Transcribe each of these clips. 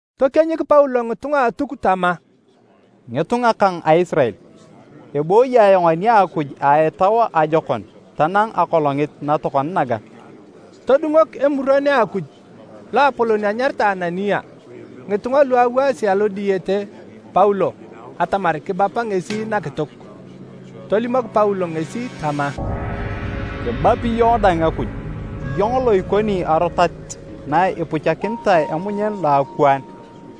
Tokienyik Paulo ngitunga a Atuk tama, “Ngitunga kang a Isirael! Ebooyi ayong ani a Akuj a etau ajokon tanang akolongit na tokona naga.” Todungok Emuron a Akuj Loapolon anyaritae Anania ngitunga lu awaasi alo diyete Paulo atamar kibapa ngesi nakituk. Tolimok Paulo ngesi tama, “Kibapi iyong dang Akuj, iyong lo ikoni arotat na ipuchakinitae emunyen lo akwaan!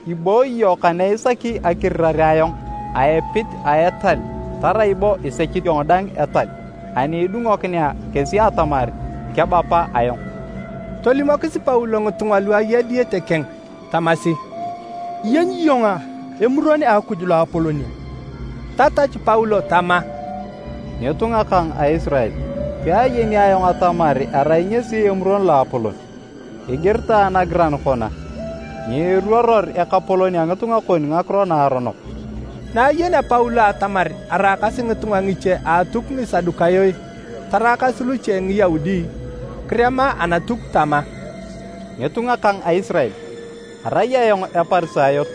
Ibooyi iyong kane isaki akirirare ayong a epit a etal tarai bo isech iyong dang etal ani idungokinea kesi atamar kebapa ayong!” Tolimokis Paulo ngitunga lu aya diyete keng tamasi, “Iyenyi iyong Emuron a Akuj Loapolon a?” Tatachu Paulo tama, “Ngitunga kang a Isirael, peayeni ayong atamar erai ngesi Emuron Loapolon. Igiritae nagiran kona, ‘Nyiiruoror ekapolon a ngitunga kon ngakiro naaronok.’” Na ayenea Paulo atamar araakasi ngitunga ngiche a Atuk Ngisadukayo taraakas luche Ngiyaudi, kirema Anatuk tama, “Ngitunga kang a Isirael! Arai ayong Eparisayot,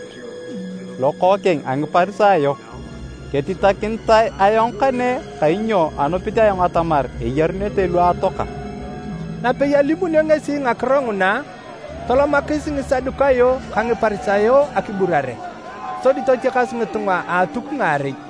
lokookeng a Ngiparisayo. Ketitakinitae ayong kane kainyo anupit ayong atamar eyarunete lu atoaka.” Napei alimunio ngesi ngakiro nguna, tolomakis Ngisadukayo ka Ngiparisayo akiburare, sodi totiakas ngitunga a Atuk ngaarei. (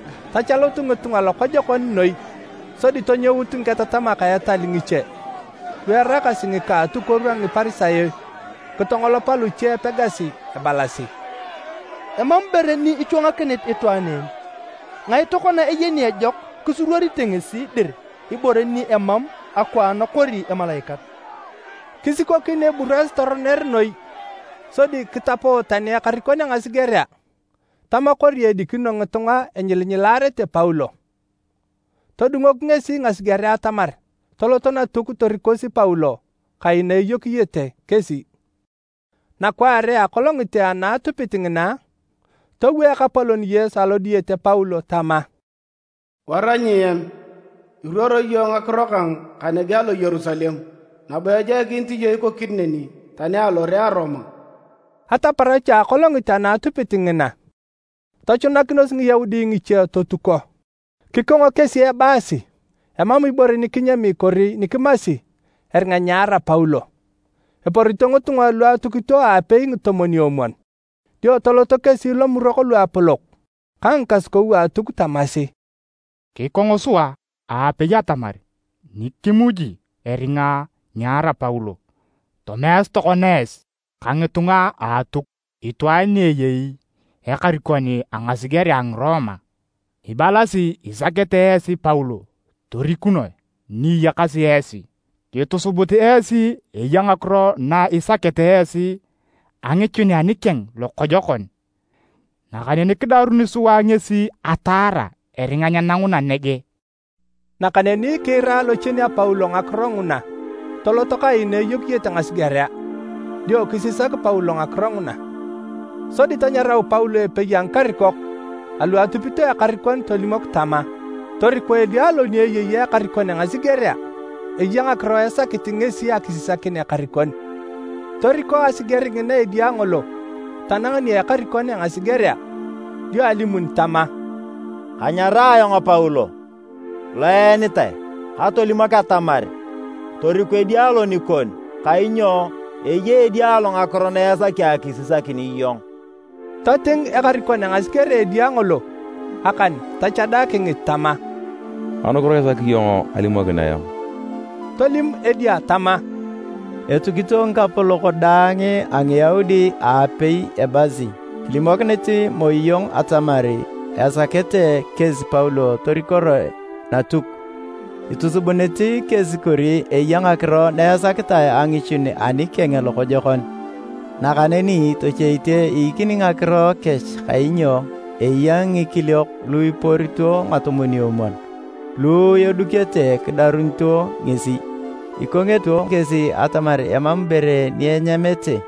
Tachalut ngitunga lokojokon noi! Sodi tonyout ngiketatamak a etal ngiche lu eraakasi ngika a atukuoru a Ngiparisayo kitongolopa luche epegasi ebalasi, “Emam ibore ni ichwangakinit itwaan en! Ngae tokona eyeni ejok kisuruorite ngesi dir ibore ni emam akwaan kori emalaikat!” Kisikokin eburas toroner noi sodi kitapo tani ekarikon a ngasigerea tama kori edikino ngitunga enyilinyilaarete Paulo. Todungok ngesi ngasigerea atamar toloto Natuk torikosi Paulo kai na eyokiyete kesi. Nakwaare a akolongit ana atupit ngina, towo Ekapolon Yesu alo diyete Paulo tama, “Wara nyiem! Iruoro iyong ngakiro kang kanege alo Yerusalem nabo ejoikinit iyong ikokini neni tani alore a Roma.” Ataparach a akolongit ana atupit ngina, tochunakinos Ngiyaudi ngiche totuko. Kikongo kesi ebaasi emam ibore ni kinyami kori ni kimasi eringa nyeara Paulo. Eporito ngitunga lu atukito aapei ngitomwon-omwon. Dio toloto kesi Lomurok Luapolok ka ngikasukou a Atuk tamasi, “Kikong sua aapei atamar nyikimuji eringa nyeara Paulo. Tomeasi tokona esi ka ngitunga a Atuk itwaan ni eyei ekarikon a ngasigerea a Ngiroma ibalasi isakete esi Paulo torikunoe ni iyakasi esi. Kitosubutu esi eya ngakiro na isakete esi angichun ani keng lokojokon. Nakaneni kidaruni sua ngesi ataara eringa nyenanguna nege.” Nakaneni kiira lochien a Paulo ngakiro nguna tolot kai na eyokiyete ngasigerea dio kisisak Paulo ngakiro nguna. Sodi tanyarau Paulo epei a ngikarikok alu atupito ekarikon tolimok tama, “Toriko edia lo ni eyei ekarikon a ngasigerea, eya ngakiro esakit ngesi akisisakin ekarikon.” Toriko asiger ngina edia ngolo tanang nia ekarikon a ngasigerea, dio alimun tama, “Kanyarae ayong Paulo lo eenitae katolimok atamar toriku edia lo nikon kainyo eya edia lo ngakiro na esaki akisisakin iyong.” Toting ekarikon a ngasigerea edia ngolo akan tochada kingit tama, “Anukiro isaki iyong alimokin ayong.” Tolim edia tama, “Etukito ngikapolok daang a Ngiyaudi aapei ebaasi kilimokinete moi iyong atamar esakete kesi Paulo torikoroe Natuk. Itusubunete kesi kori eya ngakiro na esakete angichun ani keng lokojokon. Nakaneni tochoite iikini ngakiro kech kainyo eya ngikiliok lu iporito ngitomwon-omwon lu edukete kidarut ngesi. Ikongito kesi atamar emam ibore ni enyamete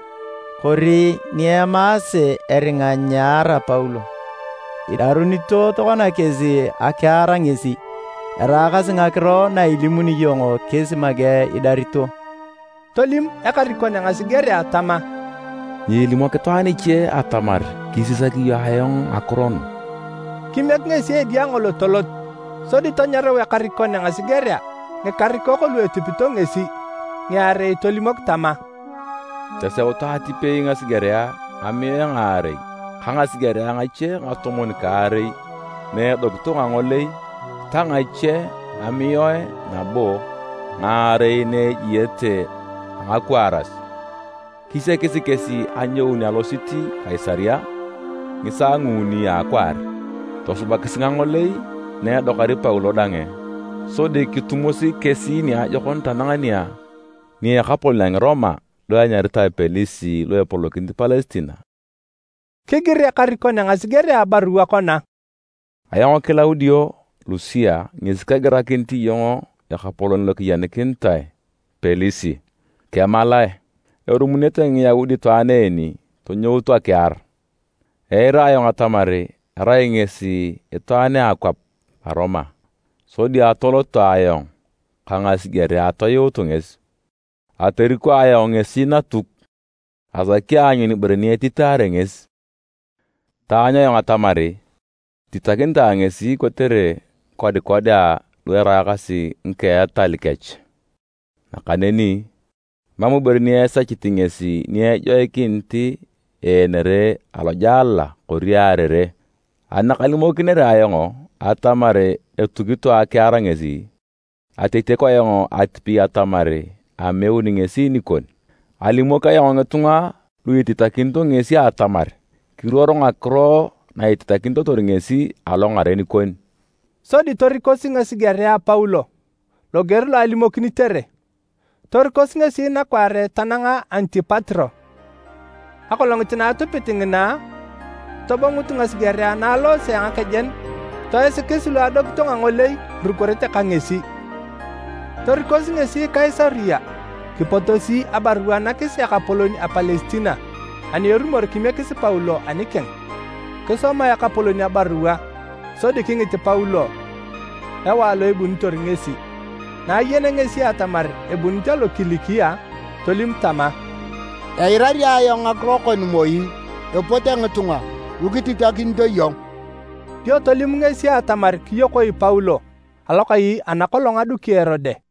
kori ni emaase eringa nyeara Paulo. Idarito tokona kesi akiar ngesi, eraakasi ngakiro na ilimuni iyong kesi make idarito.” Tolim ekarikon a ngasigerea tama, “Nyiilimok itwaan iche atamar kisisak iyong ayong ngakiro nu.” Kimiek ngesi edia ngolo tolot. Sodi tanyarau ekarikon a ngasigerea ngikarikok lu etupito ngesi ngiarei tolimok tama, “Toseutu atipei ngasigerea ngamiae ngaarei ka ngasigerea ngache ngatomwon-kaarei na edokito ngangolei ta ngache ngamiae nabo ngaarei na ejiete a ngakwaaras. Kisiakis kesi anyoun alosit Kaisaria ngisaa nguuni a akwaar. Tosubakisi ngangolei na edokari Paulo dang sodi kitumosi kesi niajokon tanang nia ekapolon a Ngiroma lo enyaritae Pelis lo epolokinit Palestina.” Kigir ekarikon a ngasigerea abarua kona, “Ayong Kilaudio Lusia ngesi kegirakinit iyong ekapolon lo kiyenikinitae, Pelis. Kemalae! Erumunete Ngiyaudi itwaan en tonyout akiar. Eira ayong atamar erai ngesi itwaan a akwap a Roma sodi atoloto ayong ka ngasigerea atoyuutu ngesi. Atoriko ayong ngesi Natuk asaki aanyun ibore ni ititaare ngesi. Ataanyu ayong atamar ititakinitae ngesi kotere ngikodikodea lu eraakasi ngika a etal kech. Nakaneni emam ibore ni esechit ngesi ni ejoikinit eenere alojela kori earere. Ani nakalimokinere ayong atamar etukitoe akiar ngesi, atotiaku ayong atipei atamar ameuni ngesi nikon. Alimok ayong ngitunga lu ititakinito ngesi atamar kiruoro ngakiro na ititakinitotor ngesi alongaren kon.” Sodi torikosi ngasigerea Paulo loger lo alimokinitere. Torikosi ngesi nakwaare tananga Antipatro. Akolongit na atupit ngina, tobongut ngasigerea na aloose a ngakejen toisikis lu adokito ngangolei irukorete ka ngesi. Torikosi ngesi Kaisaria kipotosi abarua nakis ekapolon a Palestina ani erumor kimiekis Paulo anikeng. Kisoma ekapolon abarua sodi kingit Paulo ewae lo ebunitor ngesi. Na ayenea ngesi atamar ebunit alo Kilikia, tolim tama, “Eirari ayong ngakiro kon moi epote ngitunga lu kititakinito iyong.” Dio tolim ngesi atamar kiyokoi Paulo alokai ana kolong aduki Erode.